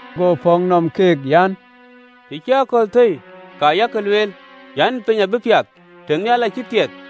Go pɔ̈k nɔm keek an, “Të cï akɔ̈l thëi, ka yak lueel an, ‘Piny abï piath, tënhial acï thiɛth.’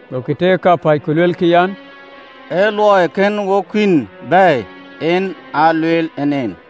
Gokï teer kapäc, ku luelkï an, “Ee luɔi kën wok kuïn bɛ̈ɛ̈i, en aa lueel en en.”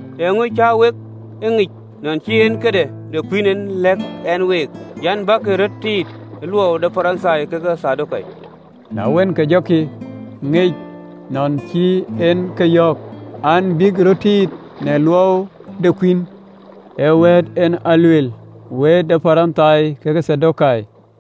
Eeŋö cä wek e ŋic, nɔn cïï en ee këde kuïn en ë lɛ̈k ɛn e week an, “Bäk röt tiit ë luɔu de Parithai kekë Thadokai!” Na wën, ke jɔkï ŋic nɔn ë cïï en ke yöök an, bïk röt tiit në luɔu de kuïn, ee wëët en ë lueel, wëët de Parithai kekë Thadokai.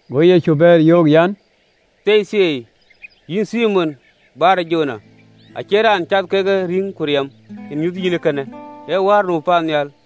Go Yecu bɛ̈ɛ̈r, yöök, an, “Thieithieei, yïn Thimon Bar-Jona, acie raan cath kekë rïïŋ ku riɛm en ë nyuth yïn ee kënë ee Wäär nu paannhial.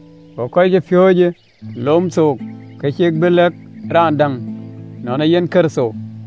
Go kɔckɛn ë piööcë lom thook, ke cïkï bï lɛ̈k raan däŋ nɔn ee yen Kërtho.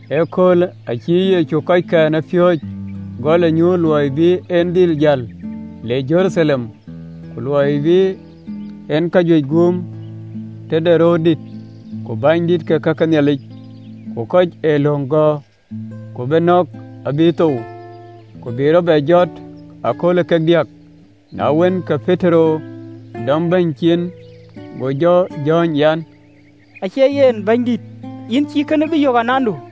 Ëköölë acï Yecu kɔckɛn ë piööcë gɔl ë nyuuth luɔi bï en dhil jäl le Jeruthalem, ku luɔi bï en kajuëc guum tëde röördït ku bänydït ke ka ke Nhialic, ku kɔc ë löŋ gɔ̈ɔ̈r, ku bï nɔ̈k abï thou, ku bï rɔt bɛ jɔt ëkööl ee kek diäk. Na wën, ke Petero dɔm Bɛ̈ny cin, go jɔ jɔ̈ɔ̈ny an, “Acie yen, Bɛ̈nydït, yïn cïï kënë bï yök anandu.”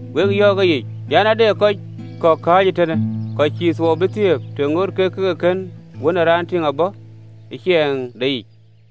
Wek yɔ̈ɔ̈k ëyic an, “Ade kɔc kɔ̈k kääc ëtënë, kɔc cïï thuɔɔu bï thiëëp, të ŋoot kek ke kën Wën ë Raan tïŋ abɔ̈ ë ciɛɛŋdeyic.